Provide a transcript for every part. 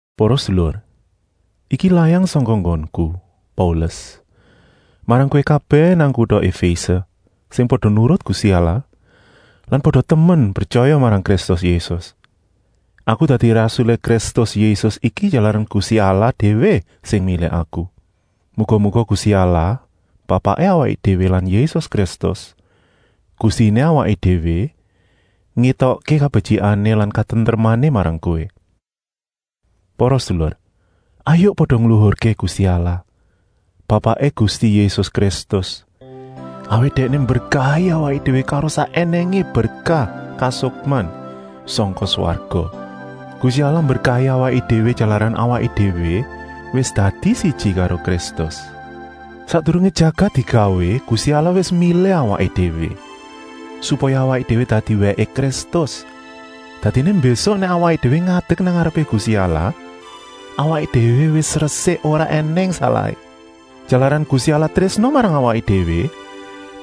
Para sedulur, iki layang sangka nggonku, Paulus, marang kowé kabèh nang kuta Efése, sing pada nurut Gusti Allah lan pada temen pretyaya marang Kristus Yésus. Aku dadi rasulé Kristus Yésus iki jalaran Gusti Allah déwé sing milih aku. Muga-muga Gusti Allah, Bapaké awaké déwé lan Yésus Kristus, Gustiné awaké déwé, ngétokké kabetyikané lan katentremané marang kowé. Para sedulur, hayuk pada ngluhurké Gusti Allah, Bapaké Gusti Yésus Kristus, awit Dèkné mberkahi awaké déwé karo sak ènèngé berkah kasukman sangka swarga. Gusti Allah mberkahi awaké déwé jalaran awaké déwé wis dadi siji karo Kristus. Sakdurungé jagat digawé Gusti Allah wis milih awaké déwé, supaya awaké déwé dadi wèké Kristus. Dadiné mbésuk nèk awaké déwé ngadek nang ngarepé Gusti Allah awaké déwé wis resik ora ènèng salahé. Jalaran Gusti Allah trésna marang awaké déwé,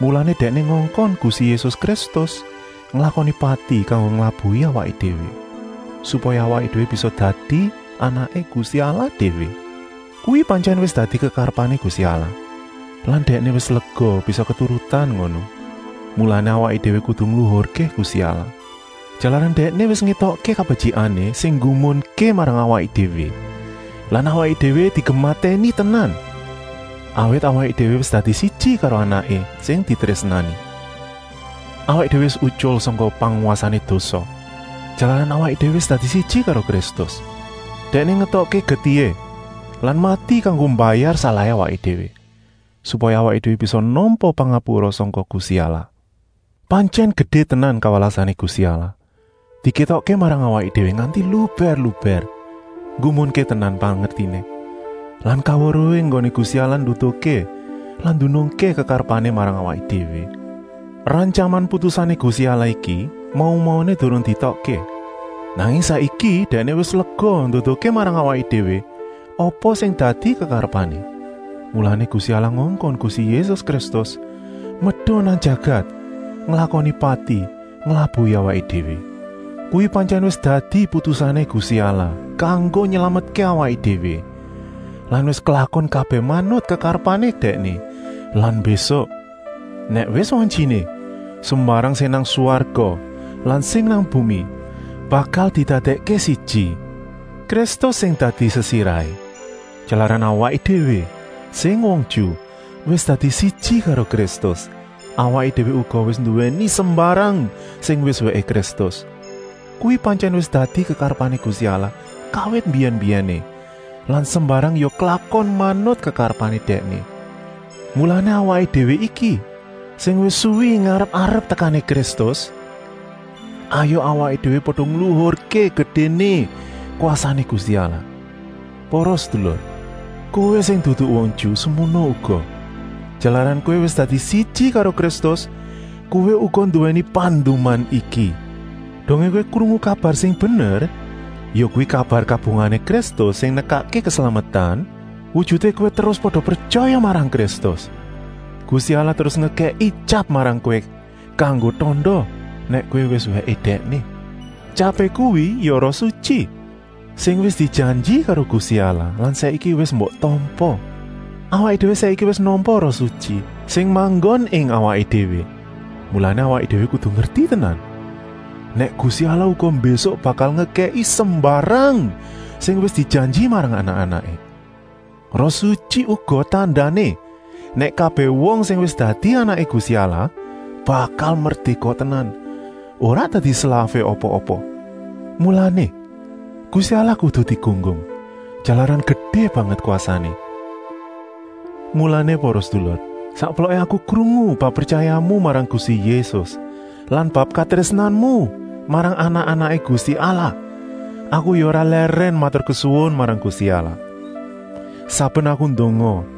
mulané Dèkné ngongkon Gusti Yésus Kristus nglakoni pati kanggo nglabuhi awaké déwé, supaya awaké déwé bisa dadi anaké Gusti Allah déwé. Kuwi pantyèn wis dadi kekarepané Gusti Allah lan Dèkné wis lega bisa keturutan ngono. Mulané awaké déwé kudu ngluhurké Gusti Allah, jalaran Dèkné wis ngétokké kabetyikané sing nggumunké marang awaké déwé lan awaké déwé digematèni tenan, awit awaké déwé wis dadi siji karo Anaké sing ditrésnani. Awaké déwé wis utyul sangka pangwasané dosa, jalaran awaké déwé wis dadi siji karo Kristus. Dèkné ngetokké getihé lan mati kanggo mbayar salahé awaké déwé, supaya awaké déwé bisa nampa pangapura sangka Gusti Allah. Pantyèn gedé tenan kawelasané Gusti Allah, dikétokké marang awaké déwé nganti lubèr-lubèr. Nggumunké tenan pangertiné lan kaweruhé enggoné Gusti Allah nduduhké lan ndunungké kekarepané marang awaké déwé. Rantyaman putusané Gusti Allah iki mau-mauné durung dietokké, nanging saiki Dèkné wis lega nduduhké marang awaké déwé apa sing dadi kekarepané. Mulané Gusti Allah ngongkon Gusti Yésus Kristus medun nang jagat nglakoni pati nglabuhi awaké déwé. Kuwi pantyèn wis dadi putusané Gusti Allah kanggo nylametké awaké déwé lan wis klakon kabèh manut kekarepané Dèkné lan mbésuk, nèk wis wantyiné, sembarang sing nang swarga lan sing nang bumi bakal didadèkké siji. Kristus sing dadi sesirahé. Jalaran awaké déwé, sing wong Ju, wis dadi siji karo Kristus, awaké déwé uga wis nduwèni sembarang sing wis wèké Kristus. Kuwi pantyèn wis dadi kekarepané Gusti Allah kawit mbiyèn-mbiyèné lan sembarang ya klakon manut kekarepané Dèkné. Mulané awaké déwé iki, sing wis suwi ngarep-arep tekané Kristus, hayuk awaké déwé pada ngluhurké gedéné kwasané Gusti Allah. Para sedulur, kowé sing dudu wong Ju, semono uga! Jalaran kowé wis dadi siji karo Kristus, kowé uga nduwèni panduman iki. Dongé kowé krungu kabar sing bener, yakuwi kabar kabungahané Kristus sing nekakké keslametan, wujuté kowé terus pada pretyaya marang Kristus. Gusti Allah terus ngekèki tyap marang kowé kanggo tanda nèk kowé wis wèké Dèkné. Tyapé kuwi ya Roh Sutyi, sing wis dijanji karo Gusti Allah lan saiki wis mbok tampa. Awaké déwé saiki wis nampa Roh Sutyi sing manggon ing awaké déwé, mulané awaké déwé kudu ngerti tenan, nèk Gusti Allah uga mbésuk bakal ngekèki sembarang sing wis dijanji marang anak-anaké. Roh Sutyi uga tandané, nèk kabèh wong sing wis dadi anaké Gusti Allah bakal merdéka tenan, ora dadi slafé apa-apa. Mulané, Gusti Allah kudu digunggung, jalaran gedé banget kwasané. Mulané para sedulur, sakploké aku krungu bab pretyayamu marang Gusti Yésus lan bab katrésnanmu marang anak-anaké Gusti Allah, aku ya ora lèrèn maturkesuwun marang Gusti Allah. Saben aku ndonga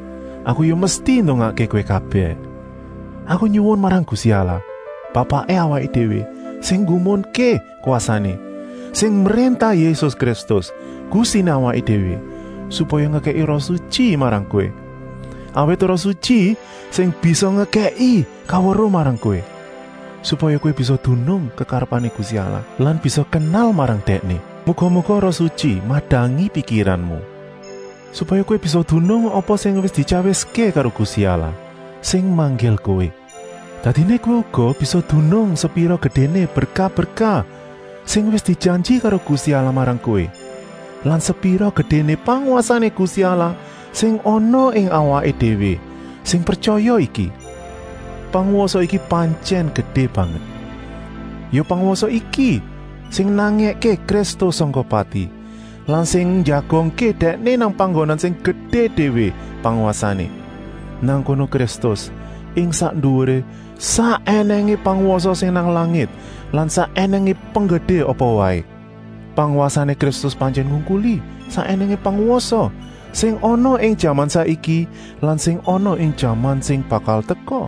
aku ya mesti ndongakké kowé kabèh. Aku nyuwun marang Gusti Allah, Bapaké awaké déwé sing nggumunké kwasané, sing mréntah Yésus Kristus, Gustiné awaké déwé, supaya ngekèki Roh Sutyi marang kowé. Awit Roh Sutyi sing bisa ngekèki kaweruh marang kowé, supaya kowé bisa dunung kekarepané Gusti Allah lan bisa kenal marang Dèkné. Muga-muga Roh Sutyi madangi pikiranmu, supaya kowé bisa dunung apa sing wis dityawiské karo Gusti Allah, sing manggil kowé. Dadiné kowé uga bisa dunung sepira gedéné berkah-berkah sing wis dijanji karo Gusti Allah marang kowé lan sepira gedéné pangwasané Gusti Allah sing ana ing awaké déwé sing pretyaya iki. Pangwasa iki pantyèn gedé banget. Ya pangwasa iki sing nangèké Kristus sangka pati lan sing njagongké Dèkné nang panggonan sing gedé déwé pangwasané. Nang kono Kristus ing sak nduwuré sak ènèngé pangwasa sing nang langit lan sak ènèngé penggedé apa waé. Pangwasané Kristus pantyèn ngungkuli sak ènèngé pangwasa sing ana ing jaman saiki lan sing ana ing jaman sing bakal teka.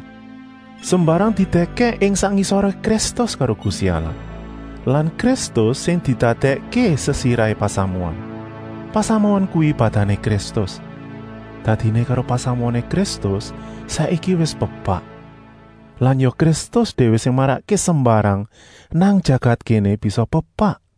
Sembarang didèkèk ing sak ngisoré Kristus karo Gusti Allah lan Kristus sing didadèkké sesirahé pasamuan. Pasamuan kuwi badané Kristus, dadiné karo pasamuané Kristus saiki wis pepak. Lan ya Kristus déwé sing marakké sembarang nang jagat kéné bisa pepak.